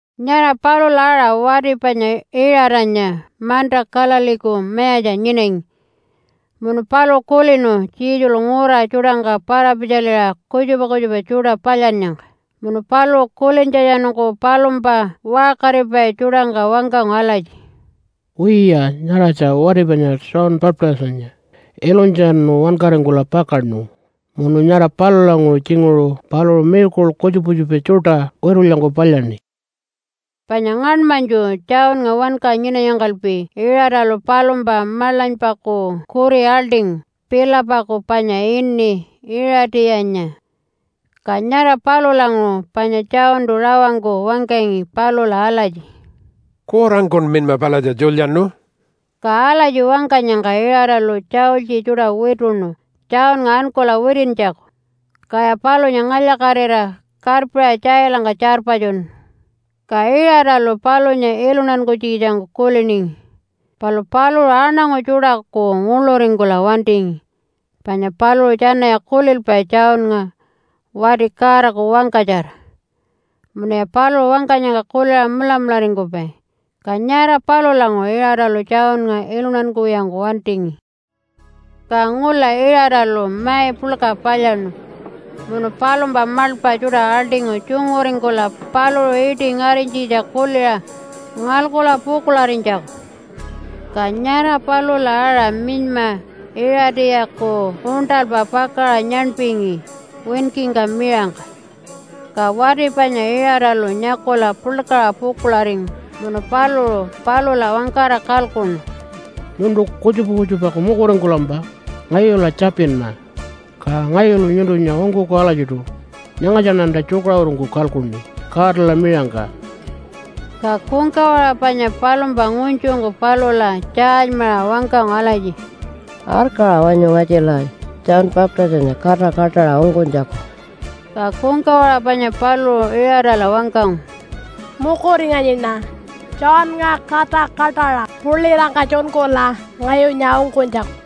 Nyara palula aṟa wati panya Iṟatanya manta Galileeku mayatja nyinangi munu paluṟu kulinu Jesulu ngura tjuṯangka para-pitjaliṟa kutjupa kutjupa tjuṯa palyannyangka. Munu paluṟu kulintjatjanungku palumpa waṟkaripai tjuṯangka wangkangu alatji, “Wiya, nyaratja wati panya John Baptistanya ilunytjatjanu wankaringkula pakaṉu, munu nyara palulanguṟu tjinguṟu paluṟu miracle kutjupa kutjupa tjuṯa witulyangku palyaṉi.” Panya ngaṉmanytju, Johnnga wanka nyinanyangkalpi, Iṟatalu palumpa maḻanypaku kuri aḻṯingu Philipaku panya ini Iṟatiyanya. Ka nyara palulanguṟu panya Johntu rawangku wangkangi palula alatji, “Kurangkun minyma palatja tjulyaṉu.” Ka alatji wangkanyangka Iṟatalu tjaultji tjuṯa wituṉu Johnnga ankula witintjaku, kaya palunya ngalya-katira karpiṟa tjailangka tjarpatjunu. Ka Iṟatalu palunya iluntankunytjikitjangku kuliningi, palu paluṟu aṉangu tjuṯaku nguḻuringkula wantingi, panya paluṟu tjanaya kulilpai Johnnga wati Godaku wangkatjara, munuya paluṟu wangkanyangka kuliṟa mulamularingkupai. Ka nyara palulanguṟu Iṟatalu Johnnga iluntankuwiyangku wantingi. Ka ngula Iṟatalu mai puḻka palyaṉu munu palumpa maḻpa tjuṯa aḻṯingu tjunguringkula paluṟu iṯi ngarinytjitja kuliṟa ngalkula pukuḻarinytjaku. Ka nyara palula aṟa minyma Iṟatiyaku uṉṯalpa pakaṟa nyaṉpingi winkingka miṟangka, ka wati panya Iṟatalu nyakula puḻkaṟa pukuḻaringu. Munu paluṟu palula wangkara kalkuṉu, “Nyuntu kutjupa kutjupaku mukuringkulampa ngayula tjapinma, ka ngayulu nyuntunya ungkuku alatjiṯu. Nyangatjaṉanta tjukaṟurungku kalkuṉi Godala miṟangka.” Ka kungkawaṟa panya palumpa ngunytjungku palula tjaalymaṟa wangkangu alatji, “Arkaṟa wanyu ngatjila John Baptistanya kata kaṯaṟa ungkunytjaku.” Ka kungkawaṟa panya paluṟu Iṟatala wangkangu, “Mukuringanyiṉa Johnnga kata kaṯaṟa pulitangka tjunkula ngayunya ungkunytjaku.”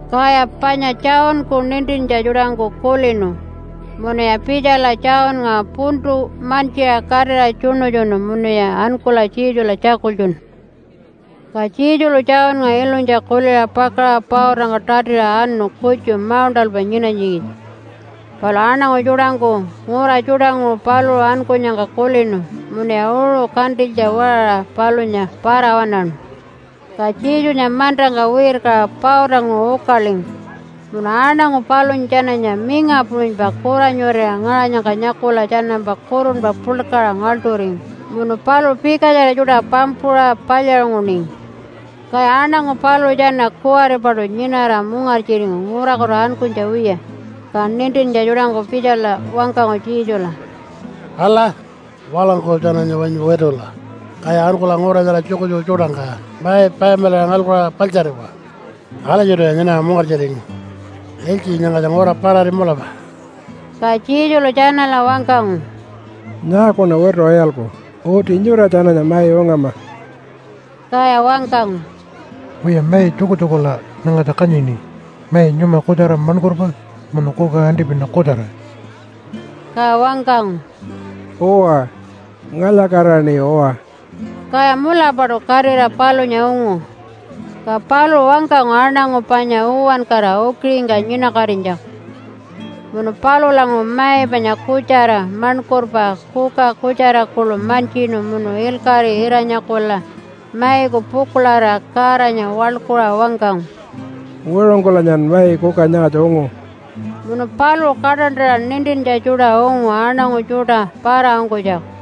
Kaya panya Johnku nintintja tjuṯangku kulinu munuya pitjala Johnnga puntu mantjiṟa katira tjuṉutjunu munuya ankula Jesula tjakultjunu. Ka Jesulu Johnnga ilunytja kuliṟa pakaṟa pautangka tatiṟa anu kutju mauṉṯalpa nyinanytjikitja. Palu aṉangu tjuṯangku ngura tjuṯanguṟu paluṟu ankunyangka kulinu munuya uṟu kantilytja waṟaṟa palunya para-waṉaṉu. Ka Jesunya mantangka wirkaṟa pautanguṟu ukalingu munu aṉangu palunya tjananya minga puṟunypa kuranyurira ngaṟanyangka nyakula tjanampa kurunpa puḻkaṟa ngaḻṯuringu, munu paluṟu pikatjara tjuṯa pampuṟa palyaṟunguningi. Kaya aṉangu paluṟu tjana kuwaripaṯu nyinara mungartjiringu ngurakutu ankunytja wiya, ka nintintja tjuṯangku pitjala wangkangu Jesula, “Ala, walangku tjananya wanyu witula, kaya ankula ngura nyara tjukutjuku tjuṯangka mai payamilaṟa ngalkula paḻtjariwa! Alatjiṯuya nyinara mungartjiringu. Ilytji nyangatja ngura parari mulapa.” Ka Jesulu tjanala wangkangu, “Nyaakuṉa wituṟa iyalku? Uti nyura tjananya mai ungama!” Kaya wangkangu, “Wiya, mai tjukutjukula nyangatja kanyini, mai nyuma kutjara maṉkurpa munu kuka antipina kutjara.” Ka wangkangu, “Uwa, ngalya-katiraṉi uwa!” Kaya mulapaṯu katira palunya ungu. Ka paluṟu wangkangu aṉangu panya uwankara ukiṟingka nyinakatinytjaku, munu palulanguṟu mai panya kutjara maṉkurpa, kuka kutjara kuḻu mantjinu munu ilkaṟi ira-nyakula maiku pukuḻarira Godanya waḻkuṟa wangkangu, “Wiṟungkulanyan mai kuka nyangatja ungu.” Munu paluṟu kaṯantaṟa nintintja tjuṯa ungu aṉangu tjuṯa para-ungkunytjaku.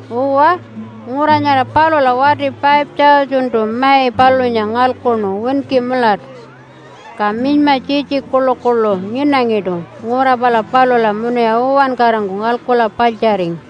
Uwa, ngura nyara palula wati 5,000-tu mai palunya ngalkuṉu winki mulatu. Ka minyma tjitji kuḻukuḻu nyinangiṯu ngura pala palula munuya uwankarangku ngalkula paḻtjaringu.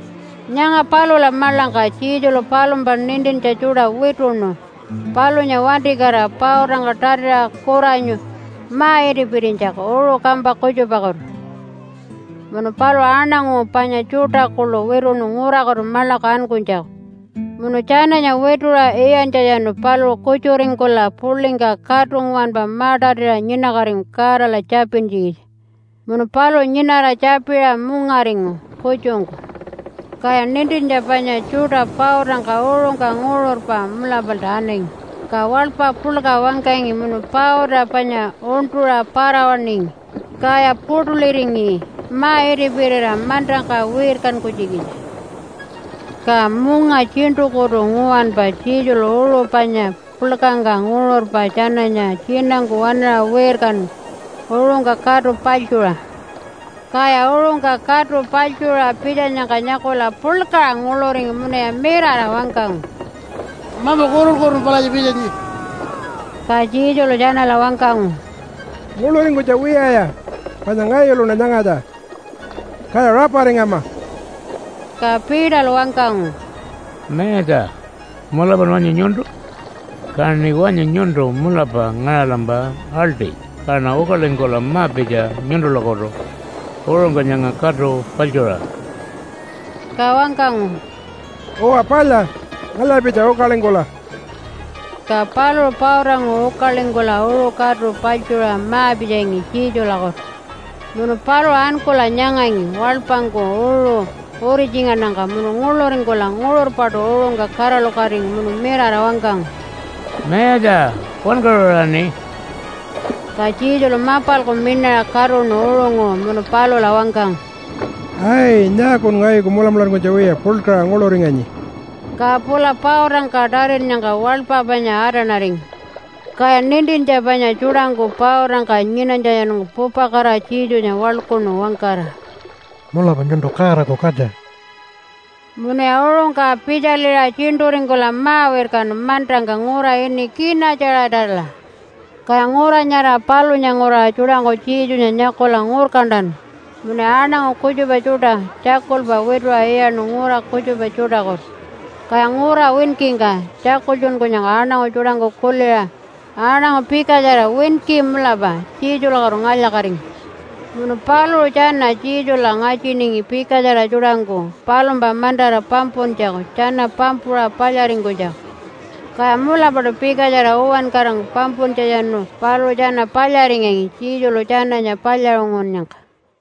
Nyanga palula maḻangka Jesulu palumpa nintintja tjuṯa wituṉu palunya wantikatira pautangka tatiṟa kuranyu ma-itipirinytjaku uṟu kampa kutjupakutu. Munu paluṟu aṉangu panya tjuṯa kuḻu wituṉu ngurakutu maḻaku ankunytjaku. Munu tjananya wituṟa iyantjatjanu paluṟu kutjuringkula puḻingka katu nguwanpa ma-tatiṟa nyinakatingu Godala tjapintjikitja. Munu paluṟu nyinara tjapiṟa mungaringu kutjungku. Kaya nintintja panya tjuṯa pautangka uṟungka nguṟurpa mulapalta anangi, ka waḻpa puḻka wangkangi munu pauta panya uṉṯuṟa para-waṉingi, kaya puṯuliringi ma-itipirira mantangka wirkankunytjikitja. Ka munga tjiṉṯukutu nguwanpa Jesulu uṟu panya puḻkangka nguṟurpa tjananya tjinangku waṉaṟa wirkanu uṟungka katu paḻtjuṟa. Kaya uṟungka katu paḻtjuṟa pitjanyangka nyakula puḻkaṟa nguḻuringu munuya mirara wangkangu, “Mamu kurun-kurunpa palatja pitjanyi.” Ka Jesulu tjanala wangkangu, “Nguḻuringkunytja wiyaya panya ngayuluṉa nyangatja, kaya raparingama!” Ka Peterlu wangkangu, “Mayatja! Mulapan wanyu nyuntu? Kaṉi wanyu nyuntu mulapa ngaṟalampa aḻṯi kaṉa ukalingkula ma-pitja nyuntulakutu uṟungka nyanga katu paḻtjuṟa.” Ka wangkangu, “Uwa palya, ngalya-pitja ukalingkula!” Ka paluṟu pautanguṟu ukalingkula uṟu katu paḻtjuṟa ma-pitjangi Jesulakutu. Munu paluṟu ankula nyangangi waḻpangku uṟu uritjingannyangka munu nguḻuringkula nguṟurpaṯu uṟungka kaṟalukatingu munu mirara wangkangu, “Mayatja! Wankaṟuraṉi!” Ka Jesulu mapalku miṉaṟa katuṉu uṟunguṟu munu palula wangkangu, “Ai! Nyaakun ngayuku mulamularingkunytja wiya puḻkaṟa nguḻuringanyi?” Ka pula pautangka tatinnyangka waḻpa panya atanaringu. Kaya nintintja panya tjuṯangku pautangka nyinanytjatjanungku pupakatira Jesunya waḻkuṉu wangkara, “Mulapa nyuntu Godaku katja.” Munuya uṟungka pitjaliṟa tjiṉṯuringkula ma-wirkanu mantangka ngura ini Kina-tjaṟatala. Kaya ngura nyara palunya nguraṟa tjuṯangku Jesunya nyakula ngurkantanu, munuya aṉangu kutjupa tjuṯa tjakulpa wituṟa iyaṉu ngura kutjupa tjuṯakutu. Kaya ngura winkingka tjakultjunkunyangka aṉangu tjuṯangku kuliṟa aṉangu pikatjara winki mulapa Jesulakutu ngalya-katingu. Munu paluṟu tjana Jesula ngatjiningi pikatjara tjuṯangku palumpa mantara pampuntjaku tjana pampuṟa palyaringkunytjaku, kaya mulapaṯu pikatjara uwankarangku pampuntjatjanu paluṟu tjana palyaringangi Jesulu tjananya palyaṟungunnyangka.